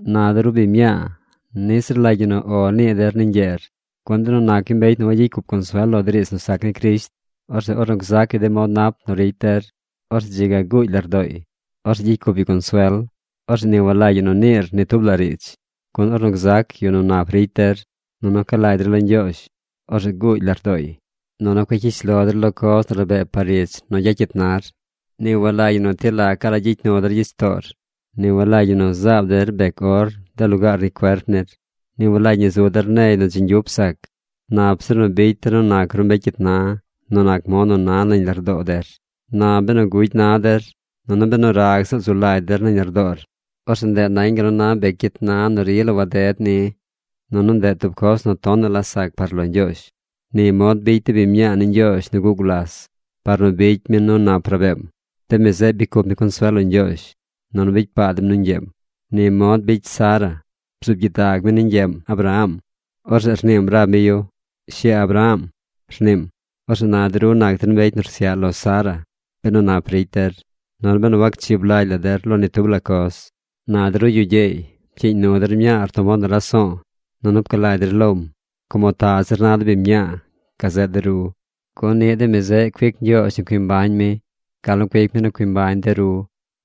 Na de ru biñ mñaa, niꞌ ziꞌl rlagy ñi nu “O” nii der ni ñgyeer, gun benu nac yu mbecy nu wagyicy cup consuel lo de riidz nu sac ni Crisht, orzeꞌ ornu gzac yu de mod nap nu ricy der, orzeꞌ dzi ga guugy lardooy. Orzeꞌ gyicy cup yu consuel. Orzeꞌ ni walagy ñi nu niir ni tub la riidz, gun ornu gzac yu nu nap ricy der, nunu ca lagy der lo Ñgyoozh, orzeꞌ guugy lardooy. Nunu cueꞌ cyish lo der lo coz nu rabee par ich nu gyacyit nar. Ni walagy ñi nu ti lacaꞌ la gyicy nu der gyich toor. Ni walagy ñi nu zaab der bec or de lugaar ni cuerp nir. Ni walagy ñi nu zu der negy nu dzi ñgyup sac. Nap zir nu bicy der nu nac ru mbecy cyit na nu nac mod nu na nañ lardoo der. Na benu gugy na der, nunu benu rag ziꞌl zu lagy der nañ lardoor, orzeꞌ ndeꞌ nañ gal nu na bec cyit na nu rila waded ni. Nunu ndeꞌ tub coz nu tonaꞌ la sac par lo Ñgyoozh. Ni mod bicy de biñ mñaa ni Ñgyoozh nu guꞌ gulas par nu bicy mi nu nap rabeem. De mi zeꞌ bicy cup mi consuel lo Ñgyoozh, nunu bicy paa dem nu ñgyeem. Ni mod bicy Sara. Bzuub gyidag mi ni ñgyeem, Abraham. Orzeꞌ rniim rab mi yu “Shi Abraham”, rniim. Orzeꞌ na de ru nac der mbecy nu rsyaꞌ lo Sara benu nap ricy der, nunu benu wacchib lagy la der lo ni tub la coz. Na de ru yu gyeey, pcyiiñ nu der mñaar tub mod nu raso̱o̱, nunu pca lagy der lom, como ta zir na de biñ mñaa gazeꞌ de ru. Gun niꞌ de mi zeꞌ cuic Ñgyoozh nu cui mbañ mi gal nu cuic mi nu cui mbañ de ru.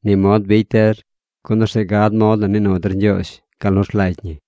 Ni mod bicy der, gun orzeꞌ gad mod nu nii nu der Ñgyoozh gal nu rlagy ñi.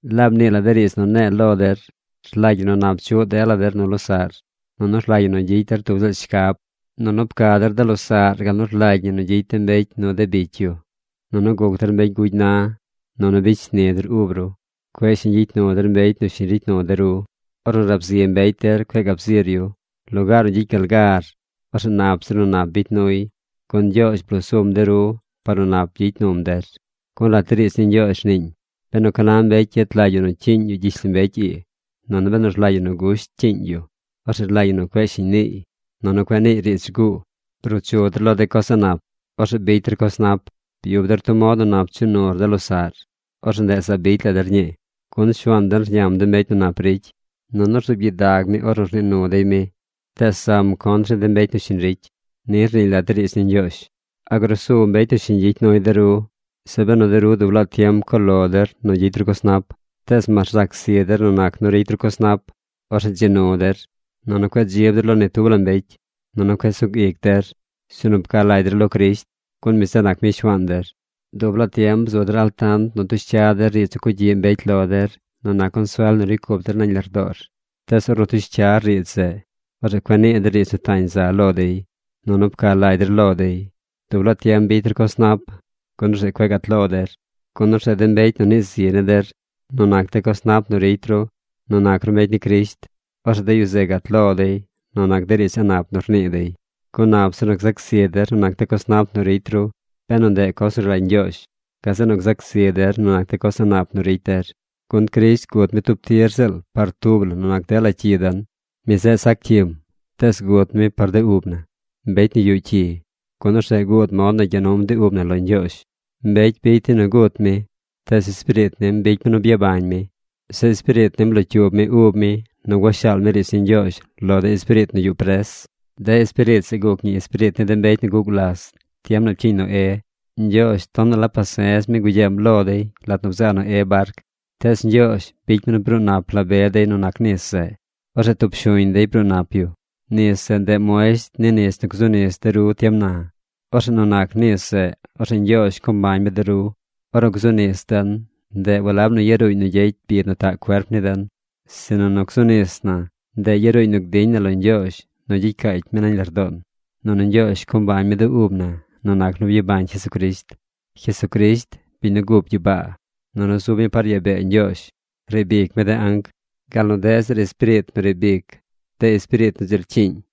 Laab nii la de riidz nu ne̱e̱ lo der. Rlagy ñi nu nap chuꞌ dela der nu losaꞌr. Nunu rlagy ñi nu gyicy der tub ziꞌl shcab. Nunu pca der de losaꞌr gal nu rlagy ñi nu gyicy de mbecy nu de bicy yu. Nunu guc der mbecy gugy na. Nunu bicy shni der ub ru. Cueꞌ shiñ gyicy nu der mbecy nu shiñ ricy nu de ru. Ornu rab zi mbecy der cueꞌ gab zir yu. Lugaar nu gyicy gal gar, orzeꞌ nap zir nu nap bicy nuy, gun Ñgyoozh bloo sum de ru par nu nap gyicy num der. Gun lat de riidz ni Ñgyoozh rniiñ: Benu ca na mbecy yet lagy yu nu cyiiñ yu gyishlombecy ii, nunu benu rlagy yu nu gusht cyiiñ yu, orzeꞌ rlagy ñi nu cueꞌ shiñ niiy, nunu cueꞌ niiy riidz rguu. Bruu chu der lo de coz a̱ꞌ nap. Orzeꞌ bicy der coz nap. Byub der tub mod nu nap nu chuꞌ nur de losaꞌr. Orzeꞌ ndeꞌ zaab bicy la der ñii. Gun Shuaan den rñam de mbecy nu nap ricy. Nunu rzuub gyidag mi ornu rnii nu dey mi. Tees zam contr ni de mbecy nu shiñ ricy. Ni Rniiñ lat de riidz ni Ñgyoozh. ¿A grusu mbecy nu shiñ gyicy nuy de ru, zeꞌ benu de ru dub laa tiem co lo der nu gyicy ru coz nap? Tees mas rzac zi der nu nac nu ricy ru coz nap, orzeꞌ ¡dzi nu der! Nunu cueꞌ dzib der lo ni tub la mbecy. Nunu cueꞌ sug ic der. Sinu pca lagy der lo Crisht, gun mi zeꞌ nac mi Shuaan der. Dub laa tiem bzu der altant nu tush cya der riidz nu cugyiꞌ mbecy lo der nu nac consuel nu ricy cup der nañ lardoor. Tees ornu tush cyar riidz zeꞌ, orzeꞌ cueꞌ nii der riidz nu tañ za lo dey, nunu pca lagy der lo dey. Dub laa tiem bicy der coz nap, gun orzeꞌ cueꞌ gat lo der. Gun orzeꞌ de mbecy nu nii zi ni der nu nac de coz nap nu ricy ru nu nac ru mbecy ni Crisht, orzeꞌ de yu zeꞌ gat lo dey nu nac de riidz a̱ꞌ nap nu rnii dey. Gun nap zir nu gzac zi der nu nac de coz nap nu ricy ru benu ndeꞌ coz nu rlagy Ñgyoozh, gazeꞌ nu gzac zi der nu nac de coz a̱ꞌ nap nu ricy der. Gun Crisht gut mi tub tir ziꞌl par tub la nu nac dela cyi den. Mi zeꞌ sac cyim. Tees gut mi par de ub na, mbecy nu yuꞌ cyi, gun orzeꞌ guud mod nu gya num de ub na lo Ñgyoozh. Mbecy bicy dey nu gut mi, tees Espiriit nim bicy mi nu byabañ mi. Zeꞌ Espiriit nim blocyuub mi ub mi nu gua shaal mi riidz ni Ñgyoozh lo de espiriit nu yuꞌ pres. De espiriit zeꞌ guc ñi espiriit ni de mbecy nu guꞌ gulas tiem nu pcyiiñ Noé. Ñgyoozh tonaꞌ la pase̱z mi gugyeem lo dey lat nu bzaa Noé barc. Tees Ñgyoozh bicy mi nu bruu nap la be dey nu nac nis zeꞌ. Orzeꞌ tub shuñ dey bruu nap yu. Nis zeꞌ, ndeꞌ muesht ni nis nu gzu nis de ru tiem na. Orzeꞌ nu nac nis zeꞌ, orzeꞌ Ñgyoozh co mbañ mi de ru. Ornu gzu nis den, ndeꞌ walab nu yaruuñ nu gyecy bid nu taꞌ cuerp ni den, sinu nu gzu nis na, ndeꞌ yaruuñ nu gdiñ na lo Ñgyoozh nu gyicy caacy mi nañ lardoon, nunu Ñgyoozh co mbañ mi de ub na nu nac nu byabañ Jesucrisht. Jesucrisht, biñ nu gup gyibaa, nunu zub mi par yaa bee Ñgyoozh, riib ic mi de anc, gal nu deꞌ zir espiriit nu riib ic de espiriit nu dzi rcyiiñ.